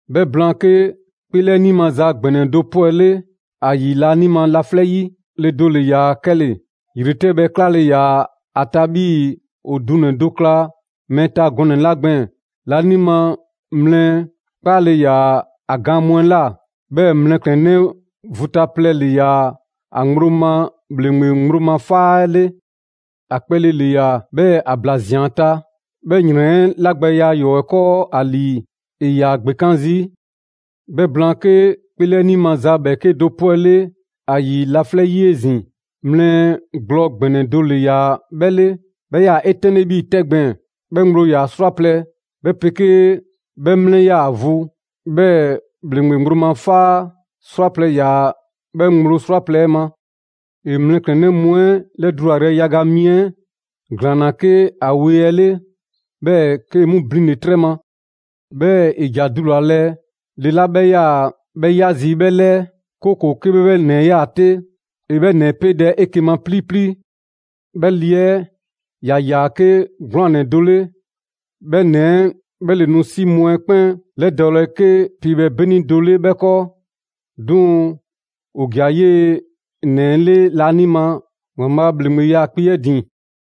'Bhɛ blaan, 'ke 'kpeelɛni maza ‑gbɛnɛ do 'pwɛle ‑a ‑yi laanima laflɛ' 'yi: le do ‑le ‑yaa 'kɛle‑. ‑Yretɛbhɛ 'klale‑ ‑yaa ‑a ta 'bhii‑ ‑o dunɛ‑ do kla mɛɛ ta gɔnɛ‑ 'la gbɛɛn‑, laanima mlɛ 'kpaale‑ ‑yaa ‑a gaan mu 'ɛ ꞊la, 'bhɛɛ‑ mlɛklɛnnɛ vu ta plɛ le ‑yaa ‑a ŋgblo ma ‑bhleŋgbe ŋgblo ma 'faa 'ɛ 'le. ‑A kpɛle ‑le ‑yaa. 'Bhɛɛ‑ ‑a ‑bla zɛnlawoa ‑a ta, 'bhɛ ‑yrɛn 'ɛ 'lagbɛya ‑yɔɔ' 'ɛ 'kɔɔ ‑a ‑lii, ‑e ‑yaa ‑gbekan' zii'. 'Bhɛ blaan, 'ke 'kpeelɛni maza 'bhɛɛke do 'pwɛle 'a ‑yi laflɛ' 'yi 'ezin‑: mlɛ gblɔ ‑gbɛnɛ do ‑le ‑yaa 'bhɛ 'le, 'bhɛ 'yaa‑ 'etɛnle 'bhii‑ 'tɛ gbɛɛn‑. 'Bhɛ ŋgblo ‑yaa 'srwaplɛ‑, 'bhɛ 'pegee 'bhɛ 'mlɛ ‑yaa vu; 'bhɛɛ‑ ‑bhleŋgbe ŋgblo ma 'faa 'srwaplɛ‑ ‑yaa 'bhɛ ŋgblo 'srwaplɛ‑ 'ɛ ma. ‑E mlɛklɛnnɛ mu 'ɛ 'lɛdulayrɛ yaga mi 'ɛ ‑glaanna 'ke ‑a wee 'ɛ 'le, 'bhɛɛ‑ 'kee‑ 'mu blinle‑ 'trɛ ma. 'Bhɛɛ‑ ‑e ‑ja dulalɛ le 'la 'bhɛ 'yaa‑ 'bhɛ 'ya zii' 'bhɛ 'lɛɛ, 'kooko‑ 'ke 'bhɛ 'bhɛ 'nɛ 'ɛ ꞊yaa 'te, ‑e 'bhɛ 'nɛ 'ɛ 'peedɛ‑ 'eke‑ ma 'pilipili. 'Bhɛɛ‑ le 'ɛ ‑ya ‑yaa 'ke 'gwlaan‑ ‑nɛ do 'le. 'Bhɛ ‑nɛ 'ɛ 'bhɛ ‑le nu 'si mu 'ɛ 'kpɛn ‑lɛdɔɔlɛ 'ke piibhɛ 'beni do 'le 'bhɛ 'kɔɔ. 'Duŋ‑ ‑o ‑ja 'yee‑ ‑nɛ 'ɛ 'le laanima ‑Waanbhaa' a ‑bhleŋgbe 'yaakpe‑ 'ɛ ‑din.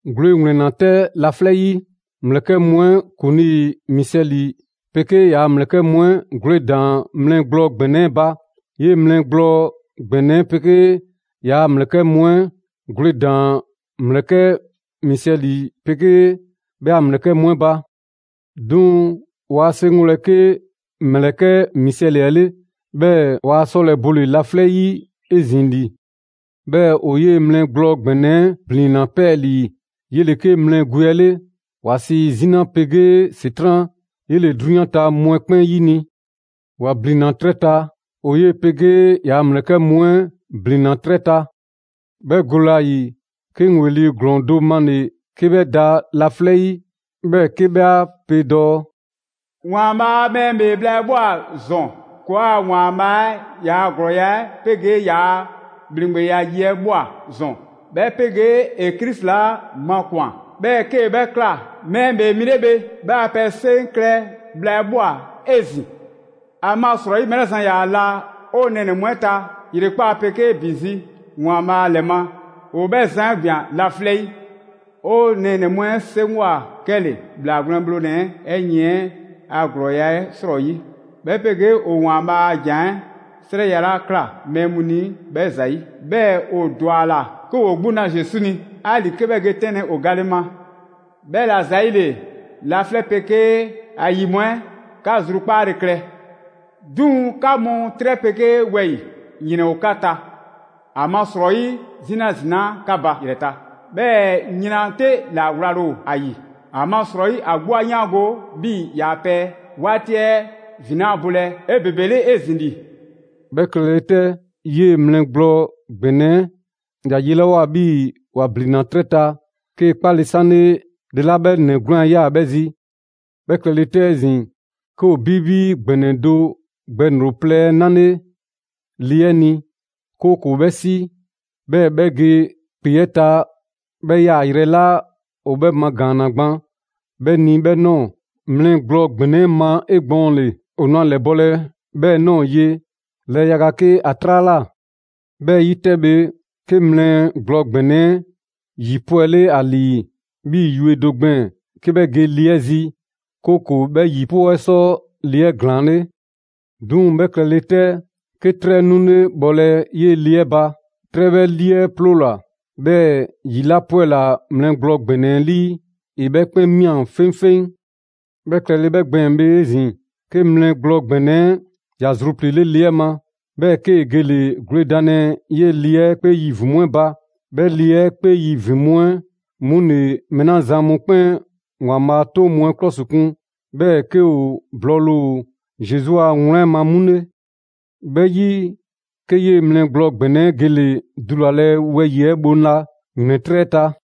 Gwle ‑wlɛnna 'tɛ laflɛ' 'yi. ‑Mlɛkɛ' mu ‑kuŋlii Misɛli 'pegee ‑yaa' ‑mlɛkɛ' mu 'ɛ gwledaan‑ mlɛ gblɔ ‑gbɛnɛ 'ɛ ba. 'Yee‑ mlɛ gblɔ ‑gbɛnɛ 'ɛ 'pegee ‑yaa' ‑mlɛkɛ' mu 'ɛ gwledaan‑ ‑mlɛkɛ' Misɛli 'pegee 'bhɛ a ‑mlɛkɛ' mu 'ɛ ba. 'Duŋ‑ ‑waa 'seŋgolɛ 'ke ‑mlɛkɛ' Misɛli 'ɛ 'le, 'bhɛɛ‑ waa 'sɔlɛ‑ bole‑ laflɛ' 'yi 'ezin‑ ‑li. 'Bhɛɛ‑ ‑o 'yee‑ mlɛ gblɔ ‑gbɛnɛ 'ɛ ‑blinna 'pɛɛlii‑. 'Yele‑ 'ke mlɛ gwe 'ɛ 'le. ‑Wa sii 'Zina 'pegee ‑Setran'. 'Yele‑ 'drunyan ta mu 'ɛ 'kpɛn 'yini‑. ‑Wa ‑blinna 'trɛ ta, ‑o 'yee‑ 'pegee ‑yaa' ‑mlɛkɛ' mu 'ɛ ‑blinna 'trɛ ta. 'Bhɛ gole ‑a ‑yi, 'ke 'ŋ ‑weli' ‑glɔɔ do male‑ 'ke 'bhɛ da laflɛ' 'yi, 'bhɛɛ‑ 'ke 'bhɛ 'a pe dɔɔ: «‑Waanbhaa' a mɛɛ ‑bhee bhla 'ɛ ꞊bhwa ‑zɔn! ‑Kɔɔa' ‑Waanbhaa' 'ɛ ‑yaa' ‑glɔɔya' 'pegee ‑yaa' ‑bhleŋgbeya yi 'ɛ ꞊bhwa ‑zɔn; 'bhɛ 'pegee ‑e Krisi 'la makwan‑, 'bhɛɛ‑ 'kee‑ 'bhɛ ꞊kla Mɛɛ ‑Bhee Mi 'le bhe, 'bhɛ a pɛ 'seŋ klɛ bhla 'ɛ ꞊bhwa 'ezin‑. ‑Amasrɔyi mɛɛ 'la zan ‑yaa la 'o nɛɛnɛ‑ mu 'ɛ ta, ‑yrekpaa' 'pegee ‑bi zi ‑Waanbhaa' ‑lɛ ma, ‑o 'bhɛ zan 'ɛ ‑gbian laflɛ' 'yi. 'O nɛɛnɛ‑ mu 'ɛ 'seŋgwa‑ 'kɛle‑, ‑Bhlaa Gwlɛn Bhlonɛ‑ 'ɛ 'yiɛn‑ 'ɛ ‑glɔɔya' 'ɛ 'srɔyi, 'bhɛ 'pegee ‑o ‑Waanbhaa' a ‑jan 'ɛ 'srɛya‑ 'la ꞊kla mɛɛ mu ni 'bhɛ ‑zayi'. 'Bhɛɛ‑ ‑o ‑dwa ‑a ‑la 'ke ‑woo 'gbu na Zesu ni, 'ali‑ 'ke 'bhɛ ge 'tɛnlɛ‑ ‑o gale ma. 'Bhɛla‑ ‑zayile, laflɛ' 'pegee ‑a ‑yi mu 'ɛ, 'ka zrukpaale klɛ! 'Duŋ‑ 'ka mu 'trɛ 'pegee wɛyi‑, ‑yrɛn ‑o 'ka ta! ‑Amasrɔyi 'Zina ‑zinaa' 'ka ba ‑yrɛ ta, 'bhɛɛ‑ yran 'te ‑la wlale ‑o ‑a ‑yi, ‑amasrɔyi ‑a 'gbu 'a 'yaango 'bhii‑ ‑yaa' pɛ 'waati 'ɛ ‑vin 'laa bolɛ 'ebebele 'ezin‑ ‑li.» 'Bhɛ klɛle 'tɛ, 'yee‑ mlɛ gblɔ ‑gbɛnɛ 'ɛ ‑ya 'yelawoa 'bhii‑ ‑wa ‑blinna 'trɛ ta, 'kee‑ 'kpale‑ 'sanle le 'la 'bhɛ ‑nɛ 'gwlaan‑ 'ɛ ꞊yaa 'bhɛ zi. 'Bhɛ klɛle 'tɛ 'ezin‑, 'ke ‑o 'bibi ‑gbɛnɛ do gbɛŋroŋ‑ plɛ 'ɛ 'nale‑ le 'ɛ ni, 'kooko‑ 'bhɛ 'si, 'bhɛɛ‑ 'bhɛ ge ‑kpe 'ɛ ta 'bhɛ yaayrɛ 'la ‑o 'bhɛ 'lɛmagaanna gban 'bhɛ ni 'bhɛ ꞊nɔɔ mlɛ gblɔ ‑gbɛnɛ 'ɛ ma 'egbɔɔnle. ‑O nu a ‑lɛbɔlɛ 'bhɛɛ‑ ꞊nɔɔ ye 'lɛɛ yaga 'ke ‑a 'traa ꞊la. 'Bhɛ 'yi 'tɛ bhe, 'ke mlɛ gblɔ ‑gbɛnɛ 'ɛ ‑yi 'pwɛle ‑a ‑lii 'bhii‑ yue do gbɛɛn‑ 'ke 'bhɛ ge le 'ɛ zi, 'kooko‑ 'bhɛ ‑yi 'ɛ 'pɔɔ 'ɛ sɔ le 'ɛ ‑glaanle'. 'Duŋ‑ 'bhɛ klɛle 'tɛ, 'ke 'trɛ 'nule bhɔlɛ 'yee‑ le 'ɛ ba: 'trɛ 'bhɛ 'lii 'ɛ 'ploola‑, 'bhɛɛ‑ ‑yi 'la 'pwɛla‑ mlɛ gblɔ ‑gbɛnɛ 'ɛ 'lii, ‑e 'bhɛ 'kpɛn ꞊mia 'feŋfeŋ. 'Bhɛ klɛle 'bhɛ gbɛɛn‑ bhe 'ezin‑, 'ke mlɛ gblɔ ‑gbɛnɛ 'ɛ ‑ya zrupliile' le 'ɛ ma, 'bhɛɛ‑ 'kee‑ gele‑ gwledanlɛ 'yee‑ le 'ɛ 'kpee yi ‑vin mu 'ɛ ba. 'Bhɛ le 'ɛ 'kpee yi ‑vin mu 'ɛ 'mu ‑le mɛɛ 'la zan mu 'kpɛn ‑Waanbhaa' a 'toŋ mu 'ɛ 'klɔsikun, 'bhɛɛ‑ 'ke ‑o blɔɔle ‑o Zesu a wlan 'ɛ ma 'mu 'le. 'Bhɛ 'yi, 'ke 'yee‑ mlɛ gblɔ ‑gbɛnɛ 'ɛ gele‑ dulalɛ wɛyi‑ 'ɛ bhoŋla ‑yrɛntrɛ' 'ɛ ta.